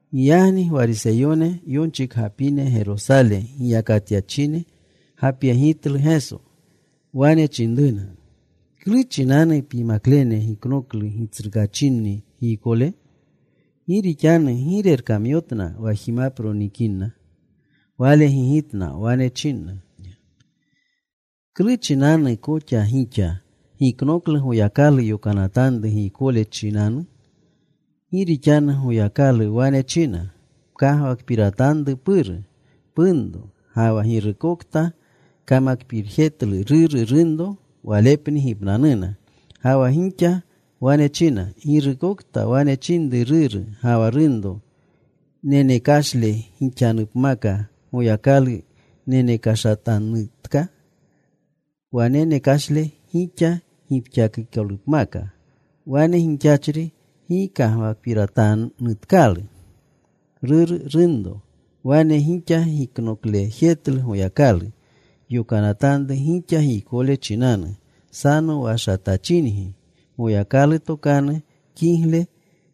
Giyagni Gwariseyone, yonchikgapine Gerosale giyakatyachine gapyegitlu Geso. Wane chinruna, “¿Klu chinanu pyimaklene giknoklu gitsrukaachinni giykole? Gi rixanu gi rerkamyotna wa jimapro nikinna.” Wale gigitna. Wane chinna, “¿Klu chinanu koxa gixa giknoklu Goyakalu yokanatanru giykole chinanu? Gi rixanu Goyakalu wane china, ‘Pkagwakpiratanru puru, punro’ ga wa ‘Girukta kamakpirjetlu ruru, runro walepni gipnanuna.’ Ga wa gixa wane china, ‘Girukokta wane chinru ruru ga wa runro, “Nenekashle gixanupmaka Goyakalu nenekashatanutka, wa nenekashle gixa gipxakikolupmaka.” Wane gixachri gi kagwakpiratanutkalu ruru, runro.’ Wane gixa giknoklejetlu Goyakalu yokanatanru gixa giykole chinanu. Sanowashatachingi. Goyakalu tokanu kigle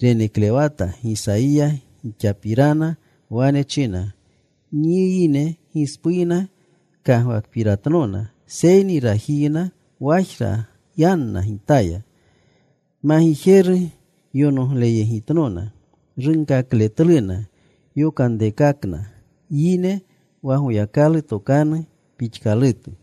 reneklewata Gisayiya gixapirana. Wane china: Nyi yine gispuyna kagwakpiratnona seyni rajiyna wajra yanna Gitaya. Magijeru yonogleyegitnona. Runkakletluna yokanrekakna yine wa Goyakalu tokanu pixkalutu.”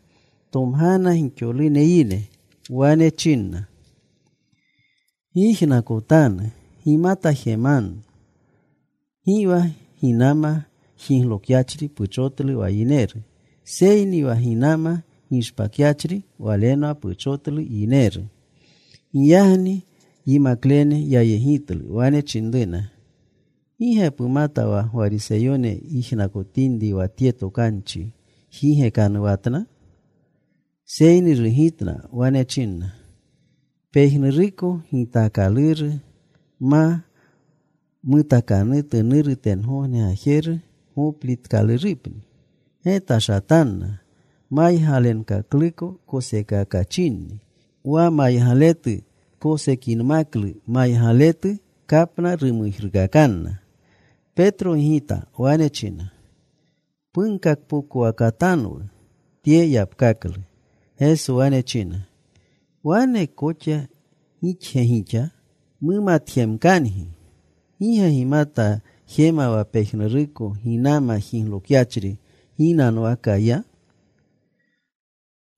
Tomgana gixolune yine. Wane chinna, “Gyijnakotanu. Gimata jemanu. Gi wa ginama jiglokyachri puchotlu wa yineru. Seyni wa ginama gishpakyachri, walenwa puchotlu yineru.” Giyagni yimaklene yayegitlu. Wane chinruna, “¿Gi ge pumata wa Gwariseyone yijnakotinri wa tye tokanchi jigekanuwatna?” Seyni rugitna. Wane chinna, “Pejnuruko gitaakaluru ma mutakanutu Nuru tengogne Gajeru goplitkalurupni. Getashatanna. Maygalenkakluko koseekakachinni. Wa maygaletu kosekinmaklu maygaletu kapna rumujruukakanna.” Petro gigita. Wane china, “Punkakpokowakatanwu tye yapkaklu.” Geso wane china, “¿Wane koxa gixge gixa mumatjemkangi? ¿Gi ge gimata jema wa pejnuruko ginama jiglokyachri, ginanwaka ya?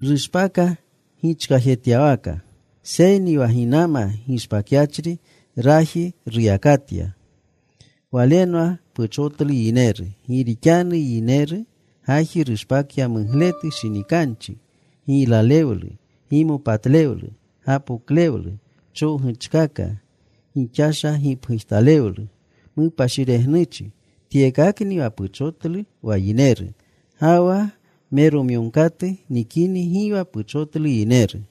Rushpaka gichkajetyawaka. Seyni wa ginama gishpakyachri raji ruyakatya. Walenwa puchotlu yineru. Gi rixanu yineru gaji rushpakya mugletu shinikanchi, giylalewlu, gimopatlewlu, gapoklewlu, chowguchkaka, gixasha gipgujtalewlu, mupashiregnuchi. Tyekakni wa puchotlu wa yineru. Ga wa meromyogkatu nikini gi wa puchotlu yineru.”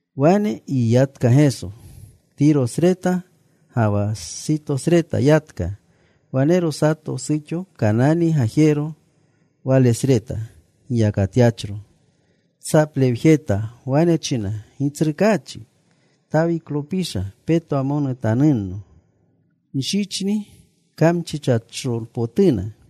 Wane yiyatka Geso. Tirosreta ga wa Sitosreta yatka. Wanero sato suxo Kanani gajero, walesreta giyakatyachro. Tsaplewjeta. Wane china, “¡Gitsrukaachi, Tawiklopisha, petwamonutanunno! Nshichni kamchichachropotuna.”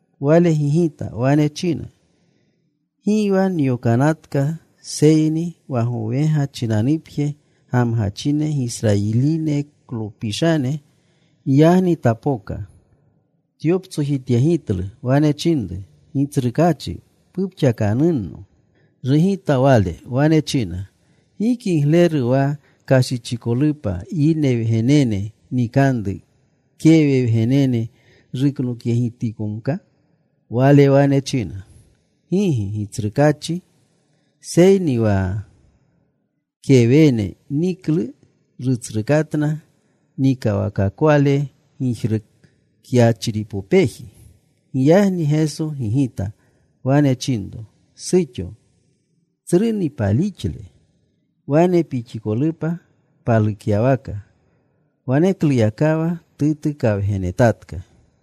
Wale gigita. Wane china, “Gi wa nyokanatka, seyni wa gowegane chinanupje gamgachine Gisrayiliklopishane.” Giyagni tapoka. Tyoptsojityegitlu. Wane chinru, “Gitsrukaachi, pupxakanunno.” Rugita Wale. Wane china, “Gi kigleru wa kashichikolupa yine wgenene nikanru, kewe wgenene ruknokyegitkomka.” Wala wane china, “Gigi, Gitsrukaachi. Seyni wa kewene niklu rutsrukatna nikawakakwale gijrukyachripopeji.” Giyagni Geso gigita. Wane chinro, “¡Suxo, tsruni palixle! Wane pixikolupa palukyawaka.” Wanekluyakawa tutukawgenetatka.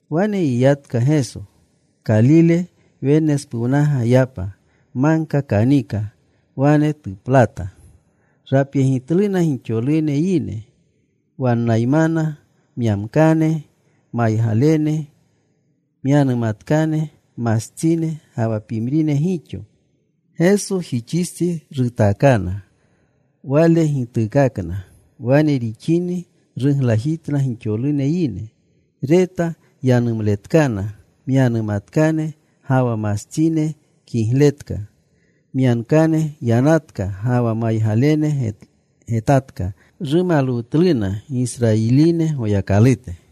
Wane yiyatka Geso. Kalile Wennespuwnaga yapa. Magka kanika. Wane tuplata. Rapyegitluna gixolune yine. Wannaymana myankane, maygalene, myanumatkane, mastsine, ga wa pimrine gixo. Gesojixistsi rutaakana. Wale gituukakna. Wane rixini ruglajitna gixolune yine, reta yanumletkana myanumatkane, ga wa mastsine kigletka, myankane yanatka, ga wa maygalene getatka. Rumalwutluna Gisrayiline Goyakalute.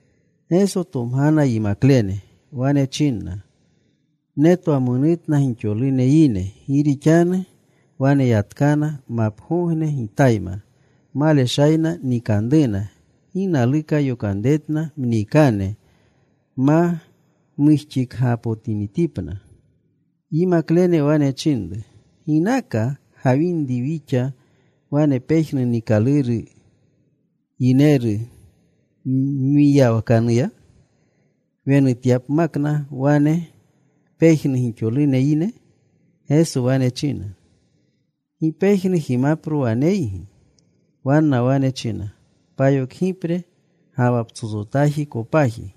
Geso tomgana yimaklene. Wane chinna, “Netwamonutna gixolune yine, gi rixanu waneyatkana mapgogne Gitayma. Maleshayna nikanruna. Gi naluka yokanretna mniikane ma mujxipakgapotinitipna.” Yimaklene wane chinru, “¿Ginaka gawinri wixa wane pejnu niikaluru yineru mwiyawakanuya, wunanutyapna wane pejnu gixolune yine?” Geso wene china, “¿Gi pejnu jimapro waneygi?” Wanna wane china, “Payokgipre ga wa psotsotaji kopaji.”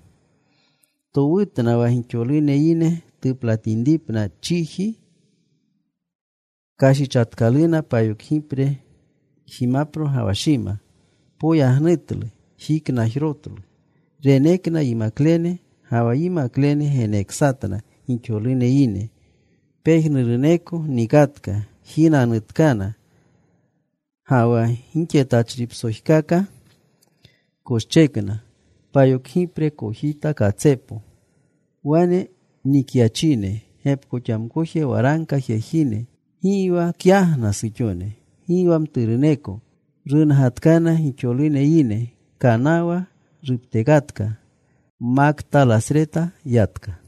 Towutna wa gixolune yine tuplatinripna chiji. Kashichatkalu payokgipre jimapro ga wa shima. Poyagnutlu. Jiknajrotlu. Renekna yimaklene, ga wa yimaklene geneksatna gixolune yine. Pejnuruneko nikatka. Jinanutkana. Ga wa gixetachripsojkaka koshchekna payokgipre kojita katsepo. Wane nikyachine gepkoxamkoje waragka jejine. Gi wa kyagna suxone, gi wa mturuneko. Rungatkana gixolune yine. Kanawa ruptekatka. Maktalasreta yatka.